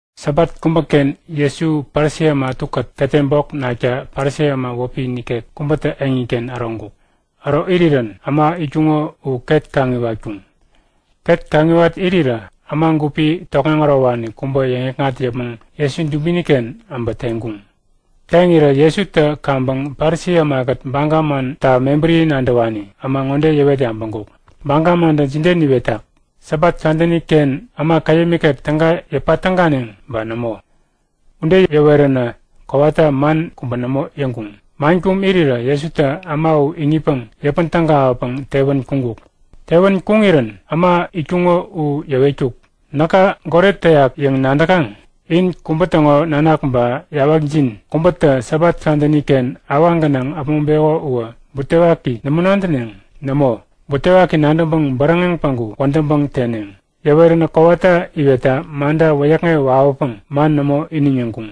Sabat kubäken Jesu Parisi äma ätukät ketem bok nakta Parisi äma wäpi nikek kubätä eŋiken äroŋkuk. Äro irirän äma itkuŋo u ket kaŋiwatkuŋ. Ket kaŋiwat irirä, äma gupi tokŋeŋ ärowani kubä yäŋikŋat yäpmäŋ Jesu dubini-ken äbä teŋkuŋ. Teŋirä Jesutä kaŋpäŋ Parisi ämakät Baga manta mebäri nadäwani äma ŋode yäwet yabäŋkuk; Baga mantä jide niwetak? Sabat kadäni-ken äma käyäm ikek täga yäpa täganeŋ ba nämo? Ude yäweränä kowata man kubä nämo yäŋkuŋ. Man kum irirä Jesutä äma u iŋitpäŋ yäpän tägawäpäŋ tewän kuŋkuk. Tewän kuŋirän äma itkuŋo u yäwetkuk; Näka goret täyak yäŋ nadäkaŋ? In kubä täŋo nanak ba yawakjin kubätä Sabat kadäni-ken awaŋ gänaŋ äpmoŋpeko uwä butewaki nämo nadäneŋ? Nämo, butewaki nadäŋpäŋ bäräŋeŋ päŋku wädäŋpäŋ teneŋ. Yäweränä kowata iwetta manta wäyäkŋewä wawäpäŋ man nämo iniŋ yäŋkuŋ.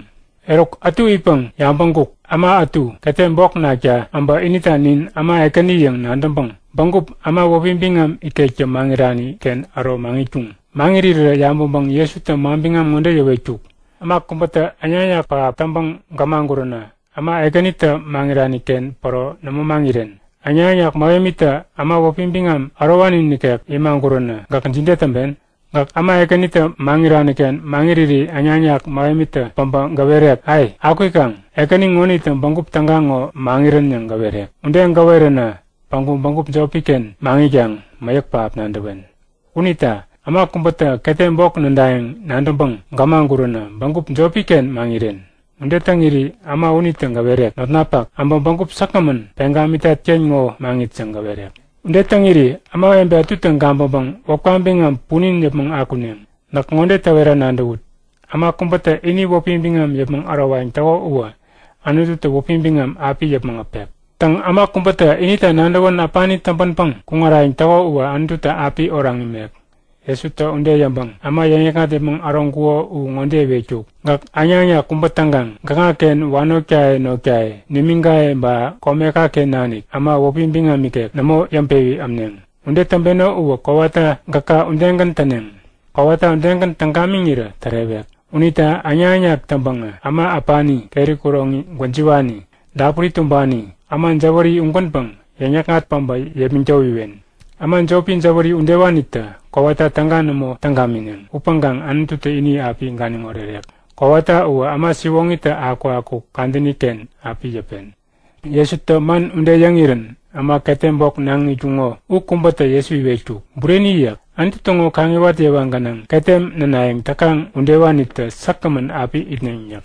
Eruk ätu itpäŋ yabäŋkuk; Äma ätu, ketem bok nakta äbä inita nin äma ekäni yäŋ nadäŋpäŋ, bägup äma wäpi biŋam ikektä maŋirani-ken äro maŋitkuŋ. Maŋirirä yabäŋpäŋ Jesutä manbiŋam ŋode yäwetkuk; Äma kubätä äŋnak-äŋnak pähap täŋpäŋ gämaguränä äma ekänitä maŋirani-ken päro nämo maŋiren. Äŋnak-äŋnak mähemitä äma wäpi biŋam ärowani nikek imaguränä gäk jide täŋpen? Gäk äma ekänitä maŋirani-ken maŋiriri äŋnak-äŋnak mähemitä päbä gäwerek; Ai, akwikaŋ, ekäni ŋonitä bägup täga ŋo maŋirän yäŋ gäwerek. Ude gäweränä päŋku bägup jopi-ken maŋitkaŋ mäyäk pähap nadäwen. Unita äma kubätä ketem bok nädayäŋ nadäŋpäŋ gämaguränä bägup jopi-ken maŋiren. Ude täŋiri äma unitä gäwerek; Notnapak, abä bägup säkgämän peŋ gamitat-ken ŋo maŋit yäŋ gäwerek. Ude täŋiri ämawebe ätutä gabäŋpäŋ wäpka biŋam punin yäpmäŋ akuneŋ. Näk ŋode täwera nadäwut; Äma kubätä ini wäpi biŋam yäpmäŋ ärowayäŋ täko uwä Anututä wäpi biŋam api yäpmäŋ äpek. Täŋ, äma kubätä inita nadäwän äpani täŋpänpäŋ kuŋarayäŋ täko uwä Anututä api oraŋ imek. Jesutä ude yäŋpäŋ äma yäŋikŋat yäpmäŋ äroŋkuko u ŋode iwetkuk; Gäk äŋnak-äŋnak kubä täŋkaŋ gäkŋaken wanotkaye notkaye nimiŋkaye ba komeka-ken nanik äma wäpi biŋam ikek nämo yäŋpewi ämneŋ. Ude täŋpeno uwä kowata gäka udegän täneŋ. Kowata udegän täŋ gamiŋirä tärewek. Unita äŋnak-äŋnak täŋpäŋä äma äpani, keri kuroŋi gwäjiwani, dapuri tumbani, äma jäwäri ugänpäŋ yäŋ-yäkŋat päbä yepmäŋ towiwen. Äma jopi jäwäri udewanitä kowata täga nämo täŋ gamineŋ, upäŋkaŋ Anututä ini api ganiŋ orerek. Kowata uwä äma siwoŋitä akukakuk kadäni-ken api yäpen. Jesutä man ude yäŋirän äma ketem bok naŋ itkuŋo u kubätä Jesu iwetkuk; Bureni yäk. Anutu täŋo kaŋiwat yewa gänaŋ ketem nänayäŋ täkaŋ udewanitä säkgämän api itneŋ yäk.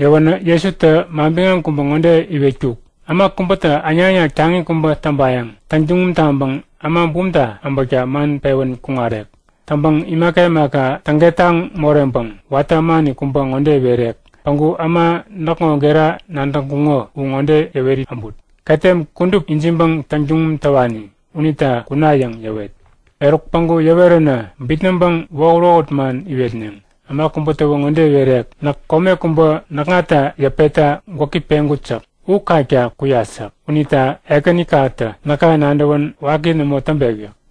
Yäwänä Jesutä manbiŋam kubä ŋode iwetkuk; Äma kubätä äŋnak-äŋnak taŋi kubä täŋpayäŋ täŋtuŋum taŋpäŋ äma bumta äbäkta man pewän kuŋarek. Täŋpäŋ imaka imaka täŋket taŋ moreŋpäŋ watä ämani kubä ŋode iwerek; Päŋku äma näkŋo gera nadäŋkuŋo u ŋode yäweri äbut; Ketem kudup ijiŋpäŋ täŋtuŋum täwani unita kuna yäŋ yäwet. Eruk päŋku yäweränä bitnäŋpäŋ wohut-wohut man iwetneŋ. Äma kubätäwä ŋode iwerek; Näk kome kubä näkŋata yäpetta gwäki peŋkut yäk. U kakta kuyat yäk. Unita ekänikatä näka nadäwän waki nämo täŋpek yäk.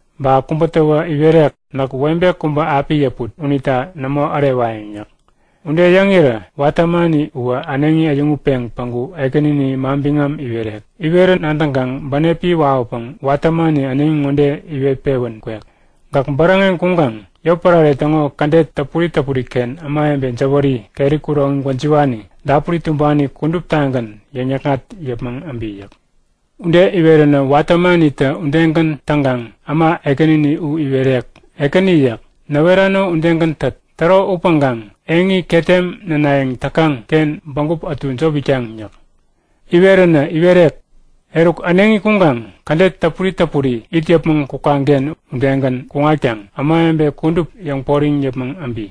Ba kubätäwä iwerek; Näk webe kubä api yäput. Unita nämo ärewayäŋ yäk. Ude yäŋirä watä ämani uwä äneŋi äyäŋutpeŋ päŋku ekänini manbiŋam iwerek. Iwerän nadäŋkaŋ bänepi wawäpäŋ watä ämani äneŋi ŋode iwet-pewän kwek; Gäk bäräŋeŋ kuŋkaŋ yotpärare täŋo kädet täpuri täpuri-ken ämawebe jäwäri, keri kuroŋi gwäjiwani, dapuri tumbani kuduptagän yäŋ-yäkŋat yäpmäŋ äbi yäk. Ude iweränä watä ämanitä udegän täŋkaŋ äma ekänini u iwerek; Ekäni yäk. Näwerano udegän tät. Täro upäŋkaŋ eŋi ketem nänayäŋ täkaŋ-ken bägup ätu jop itkaŋ yäk. Yäweränä iwerek; Eruk, äneŋi kuŋkaŋ kädet täpuri täpuri it yäpmäŋ kukaŋken udegän kuŋatkaŋ ämawebe kudup yäŋporiŋ yäpmäŋ äbi.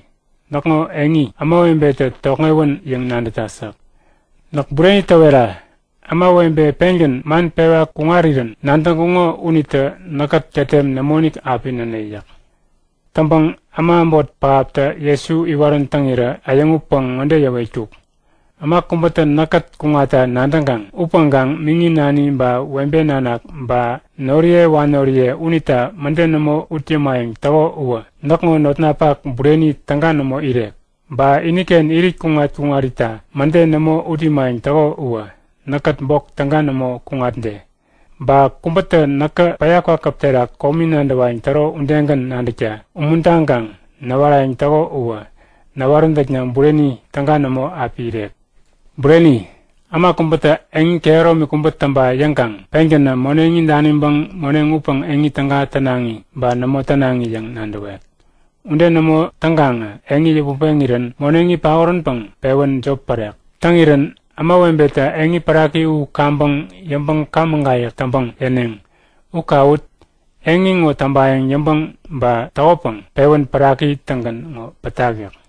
Näkŋo eŋi ämawebetä tokŋewän yäŋ nadätat yäk. Näk bureni gäwera; Ämawebe pengän man pewa kuŋarirän nadäŋkuŋo unitä näkkät ketem nämoinik api näne yäk. Täŋpäŋ äma äbot pähaptä Jesu iwarän täŋirä äyäŋutpäŋ ŋode yäwetkuk; Äma kubätä näkkät kuŋatta nadäŋkaŋ upäŋkaŋ miŋi nani ba webe nanak ba noriye wanoriye unita mäde nämo ut yämayäŋ täko uwä näkŋo notnapak bureni täga nämo irek. Ba iniken irit kuŋat-kuŋarita mäde nämo ut imayäŋ täko uwä näkkät bok täga nämo kuŋatde. Ba kubätä näkä päya kwakäp terak komi nadäwayäŋ täro udegän nadäkta umuntaŋkaŋ näwarayäŋ täko uwä näwaräntäkna bureni täga nämo api irek. Bureni! Äma kubätä eŋi kehäromi kubä täŋpa yäŋkaŋ pengänä moneŋi daniŋpäŋ moneŋ upäŋ eŋi täga tänaŋi ba nämo tänaŋi yäŋ nadäwek. Ude nämo täŋkaŋä eŋi yäput peŋirän moneŋi paoränpäŋ pewän jop pärek. Täŋirän ämawebetä eŋi päraki u kaŋpäŋ yäŋpäŋ kaŋ-mägayäk täŋpäŋ yäneŋ; U kawut! Eŋi ŋo täŋpayäŋ yäŋpäŋ ba täŋkukopäŋ pewän päraki-tägän ŋo pätak! yäk.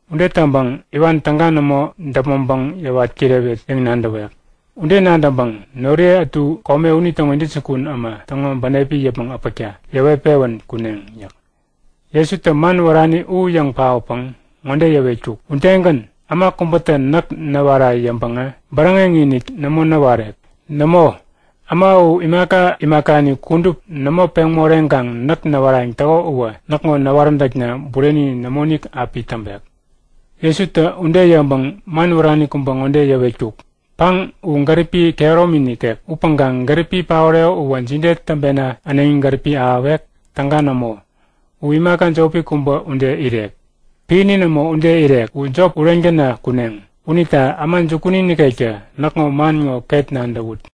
Ude täŋpäŋ iwan täga nämo däpmäŋpäŋ yäwat kirewet yäŋ nadäwek. Ude nadäŋpäŋ noriye ätu kome unitäŋo intäjukun äma täŋo bänepi yäpmäŋ äpäkta yäwet-pewän kuneŋ yäk. Jesutä man wärani u yäŋ paotpäŋ ŋode yäwetkuk; Udegän, äma kubätä näk näwara yäŋpäŋä bäräŋeŋ-inik nämo näwarek. Nämo äma u imaka imakani kudup nämo peŋ moreŋkaŋ näk näwarayäŋ täko uwä näkŋo näwaräntäkna bureni nämoinik api täŋpek. Jesutä ude yäŋpäŋ man wärani kubä ŋode yäwetkuk; Paŋ u gäripi kehäromi nikek. Upäŋkaŋ gäripi paoreko uwä jide täŋpena äneŋi gäripi ahäwek? Täga nämo! U imaka jopi kubä ude irek. Piäni nämo ude irek. U jop ureŋ täna kuneŋ. Unita äma jukuni nikektä näkŋo man ŋo ket nadäwut!